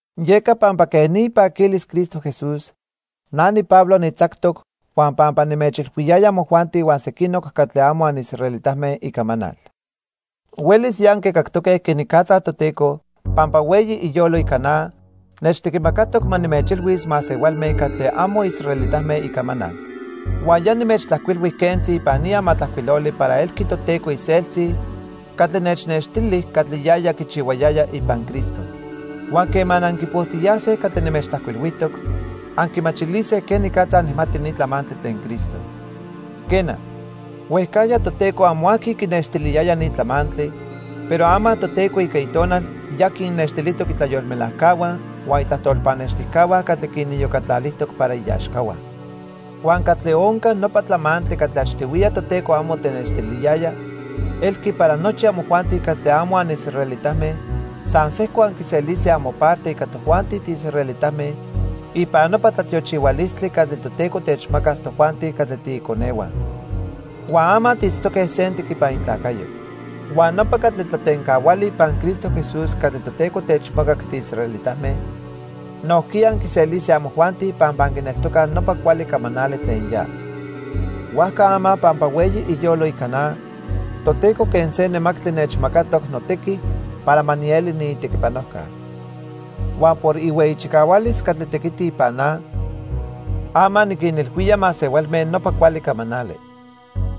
Yeca pampa quej ni ipaquilis Cristo Jesús, na niPablo nitzactoc huan pampa nimechilhuiyaya amojuanti huan sequinoc catli amo anisraelitame icamanal. Huelis ya anquicactoque quenicatza Toteco, pampa hueyi iyolo ica na, nechtequimacatoc ma nimechilhuis masehualme catli amo israelitame icamanal. Huan ya nimechtlajcuilhui quentzi ipan ni amatlajcuiloli para elqui Toteco iseltzi catli nechnextili catli yaya quichihuayaya ipan Cristo. Huan quema anquipojtiyase catli nimechtlajcuilhuijtoc, anquimachilise quenicatza nijmati ni tlamantli tlen Cristo. Quena, huejcajya Toteco amo aqui quinextiliyaya ni tlamantli, pero ama Toteco ica Itonal ya quinnextilijtoc itlayolmelajcahua huan itlajtol pannextijcahua catli quiniyocatlalijtoc para iaxcahua. Huan ¿catli onca nopa tlamantli catli achtihuiya Toteco amo tenextiliyaya? Elqui para nochi amojuanti catli amo anisraelitame san sejco anquiselise amoparte ica tojuanti tiisraelitame ipan nopa tlatiochihualistli catli Toteco techmacas tojuanti catli tiiconehua. Huan ama tiitztoque sentic ipan itlacayo. Huan nopa catli tlatencahuali ipan Cristo Jesús catli Toteco techmacac tiisraelitame, nojquiya anquiselise amojuanti pampa anquineltocaj nopa cuali camanali tlen ya. Huajca ama pampa hueyi iyolo ica na, Toteco quen se nemactli nechmacatoc notequi para ma nieli niitequipanojca. Huan por ihueyi chicahualis catli tequiti ipan na, ama niquinilhuía masehualme nopa cuali camanali.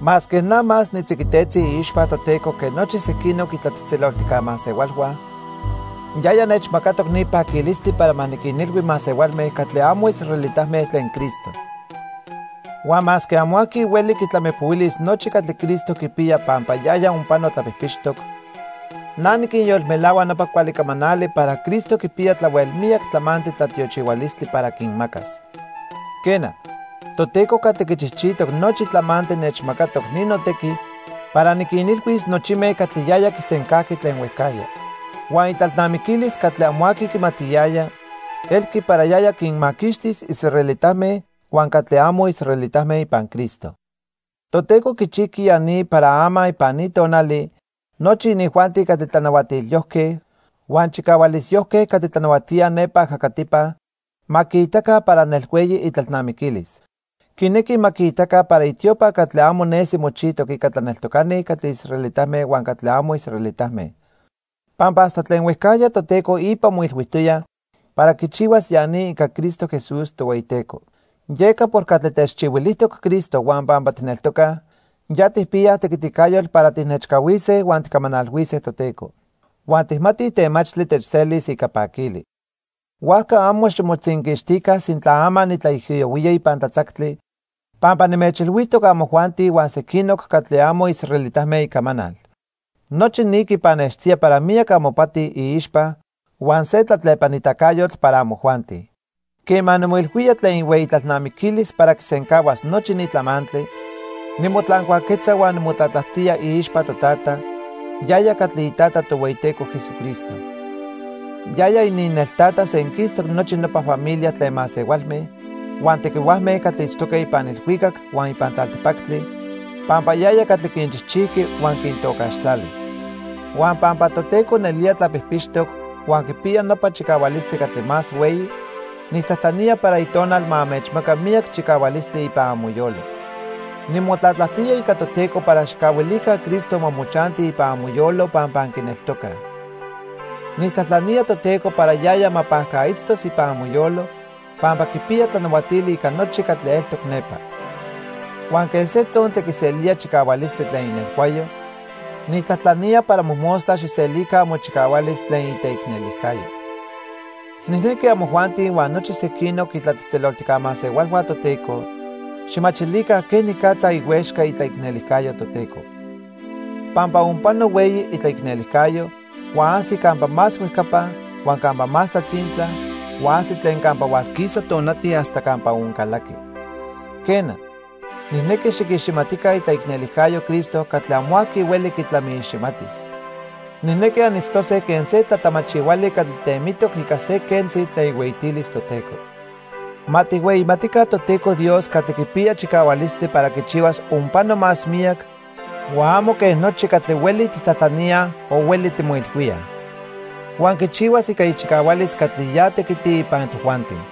Masque na más nitziquitetzi iixpa Toteco que nochi sequinoc itlatzejtzeloltijca masehualhua, yaya nechmacatoc ni paquilistli para ma niquinilhui masehualme catli amo israelitame tlen Cristo. Huan masque amo aqui hueli quitlamipohuilis nochi catli Cristo quipiya pampa yaya onpano tlapijpixtoc, na niquinyolmelahua nopa cuali camanali para Cristo quipiya tlahuel miyac tlamantli tlatiochihualistli para quinmacas. Quena, Toteco catli quichijchijtoc nochi tlamantli nechmacatoc ni notequi para niquinilhuis nochime catli yaya quisencajqui tlen huejcajya. Huan itlalnamiquilis catli amo aqui quimatiyaya elqui para yaya quinmaquixtis israelitame huan catli amo israelitame ipan Cristo. Toteco quichijqui ya ni para ama ipan ni tonali nochi inijuanti catli tlanahuatilyojque, huan chicahualisyojque catli tlanahuatíaj nepa ajacatipa ma quiitaca para nelhueyi itlalnamiquilis. Quinequi ma quiitaca para itiopa catli amo nesi mochijtoc ica tlaneltocani catli israelitame huan catli amo israelitame. Pampa hasta tlen huejcajya Toteco ipa moilhuijtoya para quichihuas ya ni ica Cristo Jesús, Tohueyiteco. Yeca por catli techchihuilijtoc Cristo huan pampa tijneltocaj ya tijpiyaj tequiticayotl para tijnechcahuise huan tijcamanalhuise Toteco. Huan tijmatij temachtli techselis ica paquili. Huajca amo ximotzinquixtica sintla ama nitlaijiyohuía ipan tlatzactli pampa nimechilhuijtoc amojuanti huan sequinoc catli amo israelitame icamanal. Nochi ni quipannextía para miyac amopati iixpa huan se tlatlepanitacayotl para amojuanti. Quema nimoilhuía tlen ihueyi tlalnamiquilis para quisencahuas nochi ni tlamantli, nimotlancuaquetza huan nimotlatlajtía iixpa Totata, yaya catli iTata Tohueyiteco Jesucristo. Yaya ininneltata senquistoc nochi nopa familia tlen masehualme huan tequihuajme catli itztoque ipan ilhuicac huan ipan tlaltipactli pampa yaya catli quinchijchijqui huan quintocaxtlali. Huan pampa Toteco nelía tlapijpixtoc huan quipiya nopa chicahualistli catli más hueyi, nijtlajtlanía para Itonal ma anmechmaca miyac chicahualistli ipan amoyolo. Nimotlatlajtía ica Toteco para xijcahuilica Cristo ma mochanti ipan amoyolo pampa anquineltocaj. Nijtlajtlanía Toteco para yaya ma pajcaitztos ipan amoyolo pampa quipiya tlanahuatili ica nochi catli eltoc nepa. Huan quen se tzontli quiselía chicahualistli tlen inelhuayo, nijtlajtlanía para mojmostla xijselica amochicahualis tlen iteicnelijcayo. Nijnequi amojuanti huan nochi sequinoc itlatzejtzeloltijca masehualhua Toteco xijmachilica quenicatza ihuexca itlaicnelijcayo Toteco. Pampa onpano hueyi itlaicnelijcayo huan ajsi campa más huejcapa, huan campa más tlatzintla, huan ajsi tlen campa hualquisa tonati hasta campa oncalaqui. Quena, nijnequi xiquiximatica itlaicnelijcayo Cristo catli amo aqui hueli quitlamiiximatis. Nijnequi anitztose quen se tlatamachihuali catli temitoc ica se quentzi tlen ihueyitilis Toteco. Ma tijhueyimatica Toteco Dios catli quipiya chicahualistli para quichihuas onpano más miyac huan amo quen nochi catli hueli tijtlajtlaníaj o hueli timoilhuíaj. Huan quichihuas ica ichicahualis catli ya tequiti ipan tojuanti.